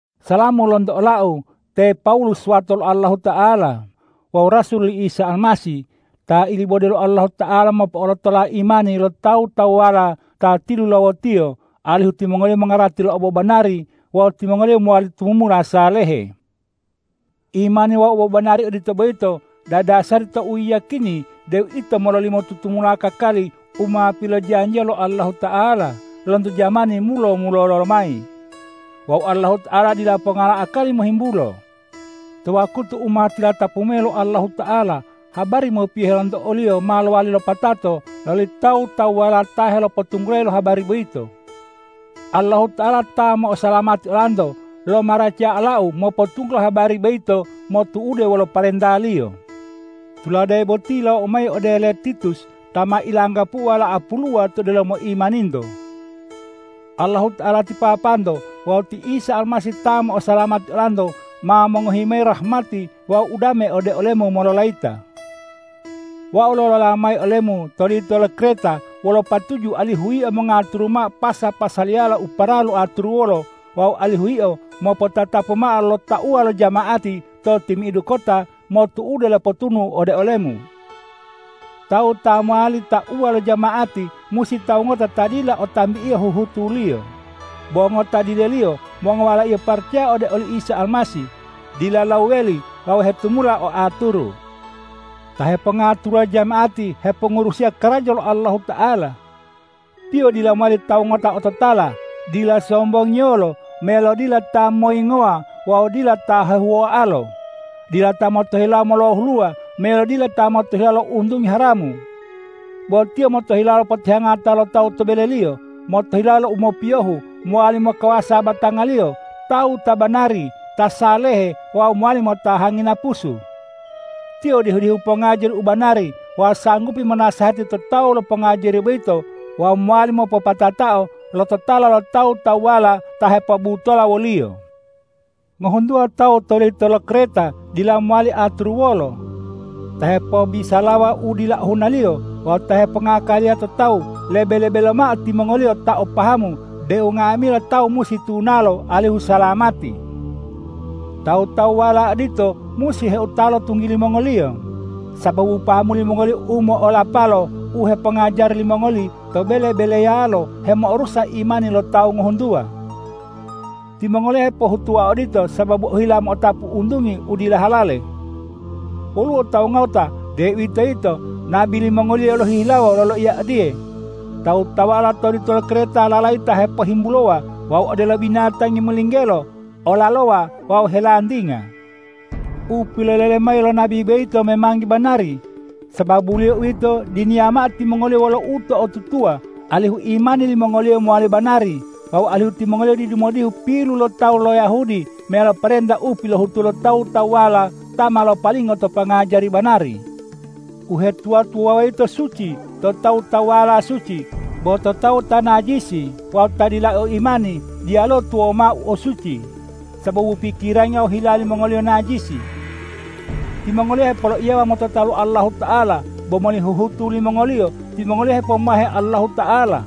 Salamu lonto olau te Pawulus wato lo Allahuta'ala wawu rasul li Isa Almasih, ta ilibode lo Allahuta'ala mopo'olotola imani lo tawu-tawuwala ta tilulawo-Tiyo, alihu timongoliyo mongarati lo obobanari wawu timongoliyo mowali tumumula salehe. Imani wawu obobanari odito boyito dadasari to uyiyakini deu ito mololimo tutumula kakali u ma pilojanjiya lo Allahuta'ala lonto jamani mulo-mulolo lomayi. Wawu Allahuta'ala dila ponga lo akali mohimbulo. To wakutu u ma tilatapu mayi lo Allahuta'ala, habari mopiyohe lonto o-Liyo ma lowali lopatato loli tawu-tawuwala ta helopotunggulayi lo habari boyito. Allahuta'ala ta mo'osalamati olanto lomaracaya olau mopotunggulo habari boyito motu'ude wolo parenta-Liyo. Tulade boti yilawou mayi ode ole Titus ta ma ilanggapu'u wala'a puluwa to delomo imaninto. Allahuta'ala ti Papanto wawu ti Isa Almasih ta mo'osalamati olanto ma mongohi mayi rahmati wawu udame ode olemu mololayita. Wau lolola mayi olemu to lito lo Kreta wolo patuju alihu yio mongaturu mao pasa-pasaliyala u paralu aturuwolo wawu alihu yio mopotatapu mao lo tauwa lo jama'ati to timi'idu kota motu'ude lo potunu'u ode olemu. Tawu ta mowali tauwa lo jama'ati musi tawu ngota ta dila o tambio huhutuliyo, bo ngota dileliyo, mongowalaiyo paracaya ode oli Isa Almasih, dila lawuweli wawu hetumula o aturu. Ta hepongaturuwa jama'ati hepongurusiya karaja lo Allahuta'ala. Tiyo dila mowali tawu ngota ototala, dila sombongiyolo meyalo dila ta moyingowa wawu dila ta hehuwoalo, dila ta motohilawo molohuluwa meyalo dila ta motohilawo lo untungi haramu. Bo tiyo motohilawo potihangata lo tawu to beleliyo, motohilawo lo u mopiyohu, mowali mokawasa batangaliyo, tawu ta banari, ta salehe wawu mowali motahangi napusu. Tiyo dihu-dihu pongajari u banari wawu sanggupi monasehati to tawu lo pongajari boyito wawu mowali mopopatatao lo totala lo tawu-tawuwala ta hepobutola woliyo. Ngohuntuwa tawu to lito lo Kreta dila mowali aturuwolo, ta hepobisalawa u dila ohunaliyo wawu ta hepongakaliya to tawu lebe-lebe lomao timongoliyo ta o pahamu deu nga'amila tawu musi tunalo alihu salamati. Tawu-tawuwala odito musi heutalo tunggili mongoliyo, sababu pahamu limongoliyo u mo'olapalo u hepongajari limongoli to bele-beleyalo hemo'orusa imani lo tawu ngohuntuwa. Timongoliyo hepohutuwa odito sababu ohila mo'otapu untungi u dila halale. Woluwo tawu ngota, deuwitoyito nabi limongoliyo lohihilawo loloiya odiye,”Tawu-tawuwala lo lito lo Kreta lalayita hepohimbulowa wawu odelo binatangi molinggelo, olalowa wawu helantinga.” U pilolele mayi lo nabi boyito memangi banari. Sababuliyo uwito, diniya mao timongoliyo wolo uto'otutuwa, alihu imani limongoliyo mowali banari, wawu alihu timongoliyo didu modihu pilu lo tawu lo Yahudi meyalo parenta u pilohutu lo tawu-tawuwala ta ma lopalingo to pongajari banari. Uhetuwa-tuwawuwa yito suci to tawu-tawuwala suci. Bo to tawu ta najisi wawu ta dila o imani, diyaluwo tuwawu mao u suci, sababu pikirangi wawu hila limongoliyo najisi. Timongoliyo hepoloiyawa motota lo Allahuta'ala, bo moli huhutu limongoliyo timongoliyo hepomahe Allahuta'ala.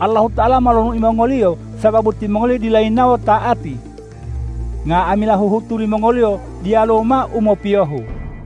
Allahuta'ala molonui mongoliyo sababu timongoliyo dila yinawo ta'ati. Nga'amila huhutu limongoliyo diyaluwo mao u mopiyohu.